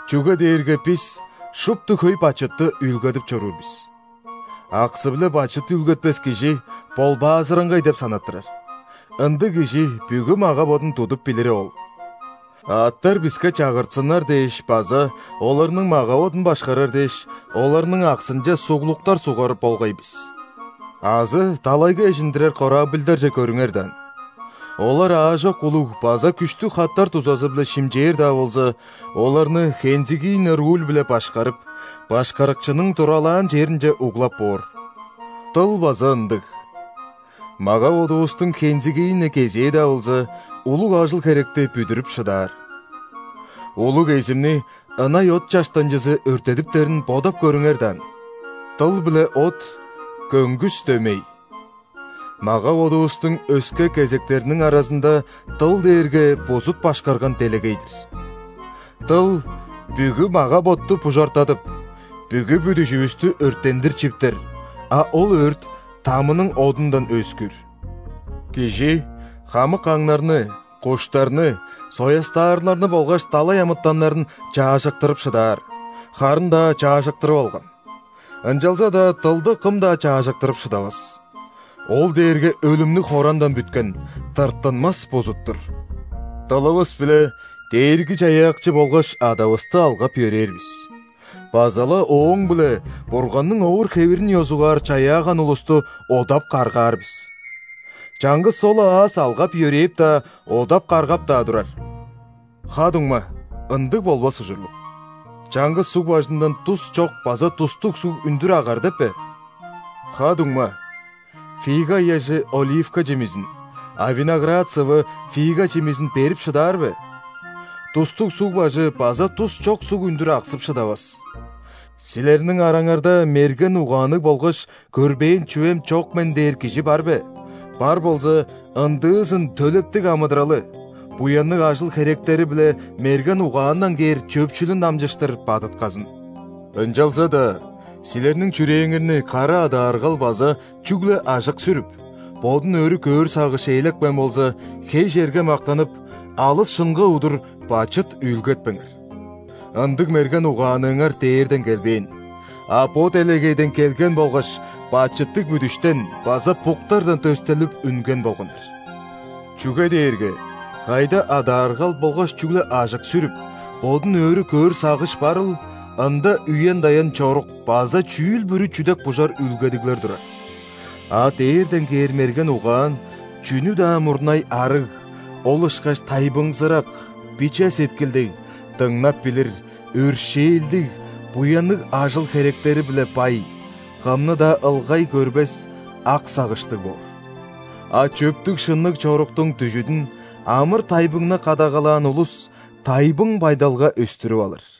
Чүге дээрге бис шупту хөй бачытты үүлгедип чоруур бис. Аксы-биле бачыт үүлгетпес кижи ·болбаазыраңгай деп санаттырар, ындыг кижи бүгү мага-бодун тудуп билири ол. Аъттар биске чагыртсыннар дээш база оларның мага-бодун башкарар дээш, оларның аксынче суглуктар сугар болгай бис. Азы далайга эжиндирер корабльдарже көрүңер даан. Олар аажок улуг база күштүг хаттар дузазы-биле шимчээр-даа болза, оларны хензигийне руль-биле башкарып, башкарыкчының туралаан черинче углап боор. Дыл база ындыг: мага-бодувустуң хензигийне кезээ-даа болза, улуг ажыл-херекти бүдүрүп шыдаар. Улуг эзимни ынай от чаштанчызы өрттедиптерин бодап көрүңер даан! Дыл биле от көңгүс дөмей. Мага-бодувустуң өске кезектериниң аразында дыл дээрге бузут башкарган делегей-дир. Дыл бүгү мага-ботту бужартадып, бүгү бүдүжүвүстү өрттендир чиптер, а ол өрт ·тамының одундан өөскүүр. Кижи хамык аңнарны, куштарны, соястаарларны болгаш далай амытаннарын чаажыктырып шыдаар, харын-даа чаажыктырып алган. Ынчалза-даа дылды кым-даа чаажыктырып шыдавас. Ол дээрге өлүмнүг хорандан бүткен, тырттынмас бузут-тур. Дылывыс-биле Дээрги-Чаяакчы болгаш Адавысты алгап-йөрээр бис, база-ла ооң-биле Бурганның овур-хевирин ёзугаар чаяаган улусту одап-каргаар бис. Чаңгыс ол-ла аас алгап-йөрээп-даа, одап-каргап-даа турар. Ха-дуңма, ындыг болбас ужурлуг! Чаңгыс суг бажындан дус чок база дустуг суг үндүр агар деп бе? Ха-дуңма, фига ыяжы оливка чимизин, а виноград сывы фига чимизин берип шыдаар бе? Дустуг суг бажы база дус чок суг үндүр аксып шыдавас. Силерниң араңарда мерген угаанныг болгаш көрбээн чүвем чок мен дээр кижи бар бе? Бар болза, ындыызын төлептиг амыдыралы, буянныг ажыл-херектери-биле мерген угаандан кээр чөпшүлүн дамчыштыр бадытказын. Ынчалза-даа силерниң чүрээңерни кара адааргал база чүгле ажык сүрүп, бодун өрү көөр сагыш ээлепкен болза, хей черге мактанып, алыс шынга удур бачыт үүлгетпеңер. Ындыг «мерген угааныңар» дээрден келбээн, а бо делегейден келген болгаш бачыттыг бүдүштен база буктардан дөстелип үнген болган-дыр. Чүге дээрге кайда адааргал болгаш чүгле ажык сүрүп, бодун өрү көөр сагыш барыл, ында үен-даян чорук база чүүл-бүрү чүдек-бужар үүлгедиглер турар. А дээрден кээр мерген угаан, чүнү-даа мурнай, арыг, ол ышкаш тайбыңзырак, биче сеткилдиг, дыңнап билир, өршээлдиг, буянныг ажыл-херектери-биле бай, кымны-даа ылгай көрбес, ак сагыштыг боор. А чөптүг-шынныг чоруктуң дүжүдүн амыр-тайбыңны кадагалаан улус тайбың байдалга өстүрүп алыр.